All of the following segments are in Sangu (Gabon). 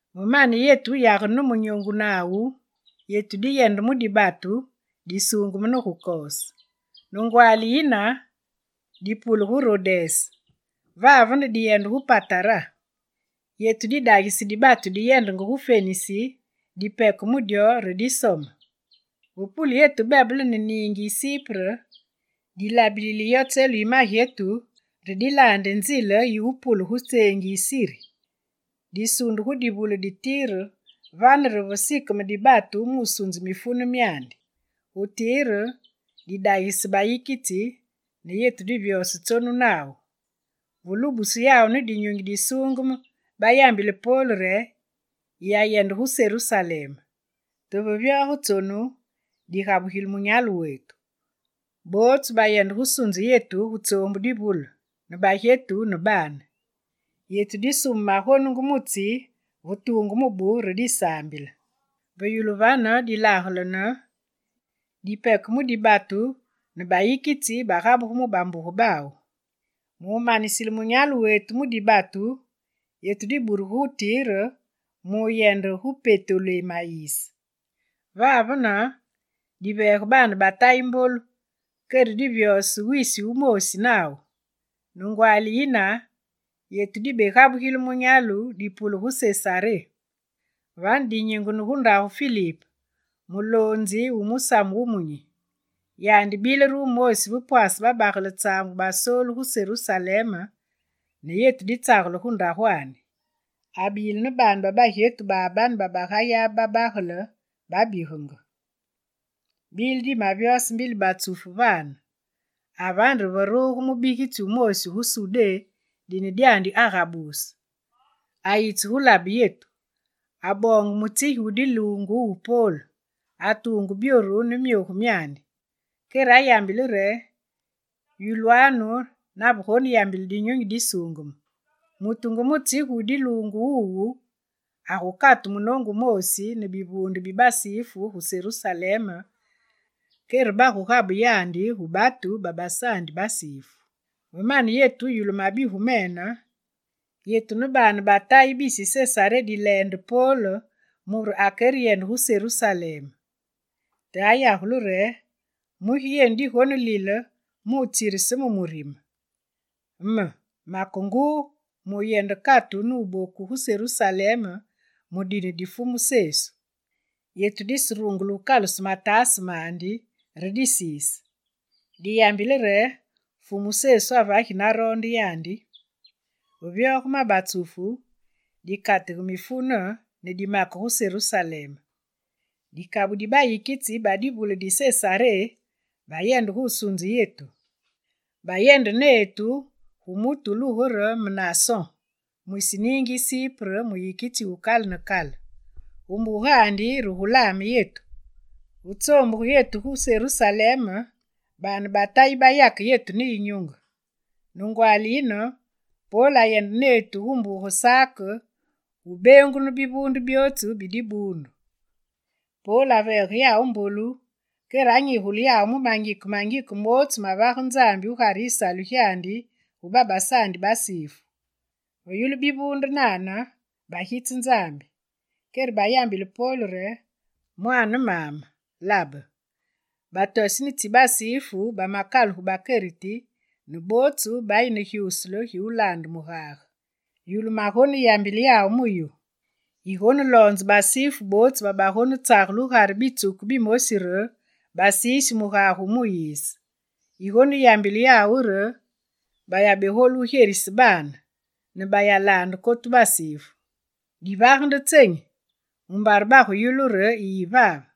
Ve mane yetu wuyagene ne munyoongu nawu, yetu diyende mu dibatu, disuungeme ne gu Kos. Ne ngwaali yine dipule gu Rodes, vavene diyende gu Patara. Yetu didagise dibatu diyendenge gu Fenisi, dipeke gu dyo re disome. Ve pule yetu bebele ne niingi yi Sipre, dilabilile yo tselu yi magyetu re dilaande nzile yi wupule gu tseengi yi Siri. Disunde gu divule di Tire, vane re ve sikeme dibatu mu wusunze mifune myandi. Gu Tire didagise bayikitsi ne yetu divyose tsonu nawu. Ve lubusu yawu ne Dinyunyi Disuungeme, bayambile Pol re: «Yiyayende gu Serusalem!» Te ve vyoge tsonu, digabugile munyalu wetu. Bootsu bayende gu wusunze yetu gu tsoombu divule ne bagyetu ne baane. Yetu disume magonungu mu tsi ve tuungu mubu re disaambile. Ve yulu vane, dilagelene, dipeke mu dibatu ne bayikitsi bagabugu mu bambuge bawu. Mu wumanisile munyalu wetu mu dibatu, yetu diburugu gu Tire mu wuyende gu Petolémayise. Vavene diveege baane ba Tayi mbolu kere divyose wisi wumoosi nawu. Ne ngwaali yine, yetu dibegabugile munyalu ne dipule gu Sesaré. Vane, dinyingene gu ndagu yi Filip, muloonzi wu Musamu Wumunyi. Yandi bile re wumoosi va pwaase babagele tsaambu basoolu gu Serusalem ne yetu ditsagele gu ndagwandi. Abile ne baane ba bagyetu babane bagayabe babagele, bababigenge. Bile dimavyose mbili batsufu vane, avane re veruge mubigitsi wumoosi gu Sudé, dine dyandi Agabus. Ayitse gu labe yetu. Aboonge mutsigi wu diluungu wu Pol, atuunge byoru byandi ne myogu myandi, kere ayambile re: «Yulwanu navegoneyambile Dinyunyi Disuungeme: “Mutu nge mutsigi wu diluungu wuwu agukatu munoongu wuwu ne bivuunde bi basifu gu Serusalem, kere bagugabe yandi gu batu babasaandi basifu.”» Ve mane yetu wuyulu mabigu mene, yetu ne baane ba Tayi bisi Sesaré dileende Pol mure akereyende gu Serusalem. Te ayagule re: «Mugi yenu digonelile mu wutsirise me murime? Me, make nguu mu wuyende katu ne wuboku gu Serusalem mu dine di Fumu Sesu.» Yetu diserungule wukaluse mataase mandi re disiise. Diyambile re: «Fumu Sesu avagi naroonde yandi!» Ve vyoge ma batsufu, dikatige mifune ne dimake gu Serusalem. Dikabu di bayikitsi ba divule di Sesaré bayende gu wusunze yetu. Bayende netu gu mutu wulugu re Menason mwisi niingi yi Sipre, muyikitsi wukale ne kale. Gu mbugandi re gu laame yetu. Ve tsoombuge yetu gu Serusalem, baane ba Tayi bayake yetu ne yinyunge. Ne ngwaali yine, Pol ayende netu gu mbuge Sak gu beengunu bivuunde byootsu bi dibuundu. Pol aveege yawu mbolu, kere anyigule mu mangike mangike mootsu mavage Nzambi gugare yisalu gyandi gu babasaandi basifu. Ve yulu bivuunde nane, bagitse Nzambi. Kere bayambile Pol re: «Mwaane maame, labe, batoseni tsi basifu bamakaluge bakereti ne bootsu bayi ne gyuusule gi wulaande mugage. Yulu magonenyigule yawu mu yu: yigoneloonze basifu bootsu babagonetsagele gugare bitsuku bimosi re basiisi mugage wu Muyise. Yigoneyambile yawu re bayabegolu wugyerise baane, ne bayalaande kotu basifu. Divage nde tsenyi? Mumbare baguyulu re yiyi vave.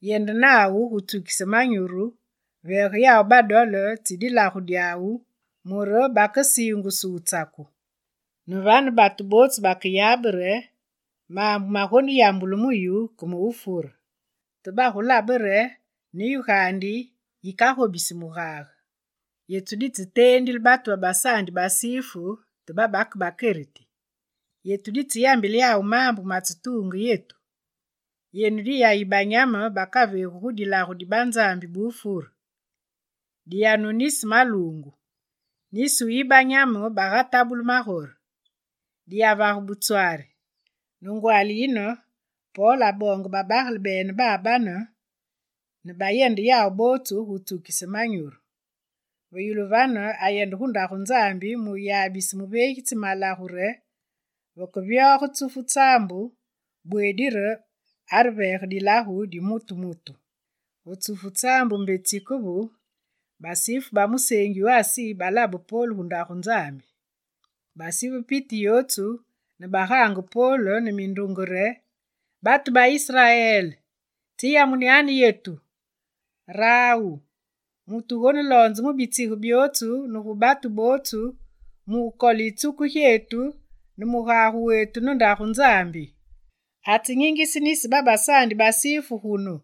Yende nawu gu wutsukise manyuru, veege yawu badole tsi dilagu dyawu, mure bakasiingusu wutsaku. Ne vane batu bootsu bakeyabe re maambu magonenyigulu mu yu ke ma wufure. Te bagulabe re ne yu gaandi, yikagobisi mugage. Yetu ditseteendile batu babasaandi basifu te babake bakeriti. Yetu ditseyambile yawu maambu matsetuunge yetu: “Yenu diyayi banyame bakaveegu gu dilagu di banzambi ba wufure, diyanu nisi maluungu, nisi wuyi banyame bagatabulu magore. Diyavage butswari.”» Ne ngwaali yine, Pol aboonge babagele bene babane ne bayende yawu bootsu gu wutsukise manyuru. Ve yulu vane, ayende gu Ndagu Nzambi mu wuyabise muveegitsi malagu re vakevyoge tsufu tsaambu bweedi areveege dilagu di mutu mutu. Ve tsufu tsaambu mbe tsikevu, basifu ba museengi wu Asi balabe Pol gu Ndagu Nzambi. Basive piti yootsu ne bagaange Pol, ne mindunge re: «Batu ba Israel, tsiyamunyanu yetu! Rawu, mutu wugoneloonze mu bitsige byootsu ne gu batu bootsu mu wukole yitsuku gyetu ne mugage wetu ne Ndagu Nzambi! Atsenyingise nisi babasaandi basifu gunu,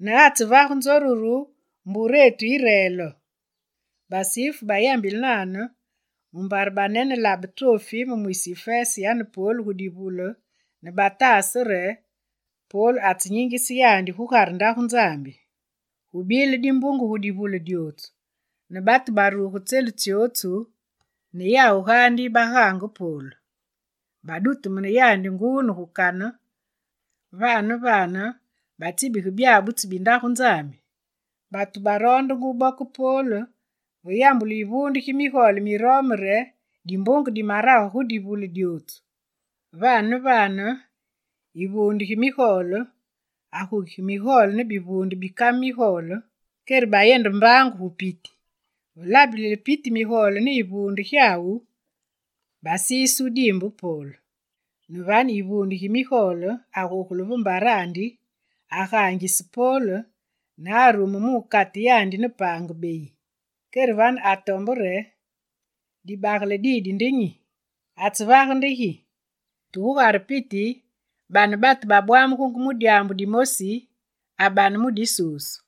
ne atsevage nzoruru mburene yi reel.» Basifu bayambile nane mumbare banenelabe Trofime mwisi Ifese yane Pol gu divule ne bataase re Pol anyingise yandi gugare Ndagu Nzambi. Gubile dimbunge gu divule dyootsu ne batu baruge tselu tsyootsu ne yawu gaandi bagaange Pol. Badutemune yandi nguu ne gu kane, vane ne vane batsibige byabutsu bi Ndagu Nzambi. Batu baroondenge wuboke Pol, ve yambulu yivuunde gi migole mi Rome re, dimbunge dimarage gu divule dyootsu. Vane ne vane, yivuunde gi migole agukige migole ne bivuunde bi kame migole, kere bayende mbaangu gu piti. Ve labilile piti migole ne yivuunde gyawu, basise wudiimbe Pol. Ne vane, yivuunde gi migole agogule ve mbarandi, agaangise Pol, ne arume mu wukate yandi ne paange beyi. Kere vane atombe re: «Dibagele didi nde nyi? Atsevage nde gi?» Te gugare piti, bane batu bayamenge mindunge mu dyaambu dimosi, abane mu disusu.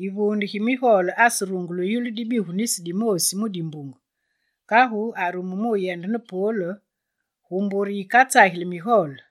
Yivuunde gi migole aserungule wuyulu dibigu nisi dimoosi mu dimbunge; kagu arume mu wuyende ne Pol gu mbure yikatsageli migole.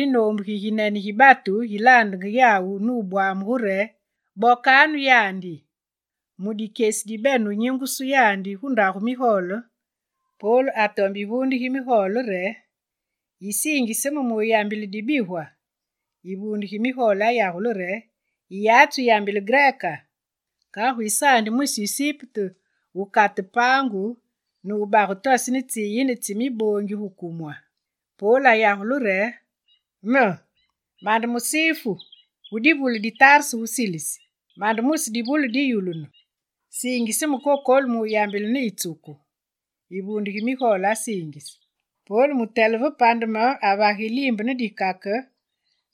yinoombu giginene gi batu gilaandenge yawu ne wubwamugu re: «Bokanu yandi!» Mu dikyesi dibene wunyingusu yandi gu ndagu migole, Pol atombe yivuunde gi migole re: «Yisiingise me mu wuyambile dibigwa?» Yivuunde gi migole ayagule re: «Yiyatsi wuyambile greka? Kagu yisaandi mwisi Isipte wukate paangu ne wubage toseni tsiyine tsi miboongi gu kumwa?» Pol ayagule re: «Me, mande musifu, wu divule di Tarse gu Silisi. Mande mwisi divule diyulunu. Siingise me, kokolu, mu wuyambile ne yitsuku!» Yivuunde gi migole asiingise. Pol mutele ve pandeme avage yiliimbe ne dikake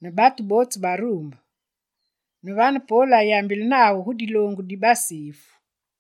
ne batu bootsu baruumbe. Ne vane Pol ayambile nawu gu diloongu di basifu.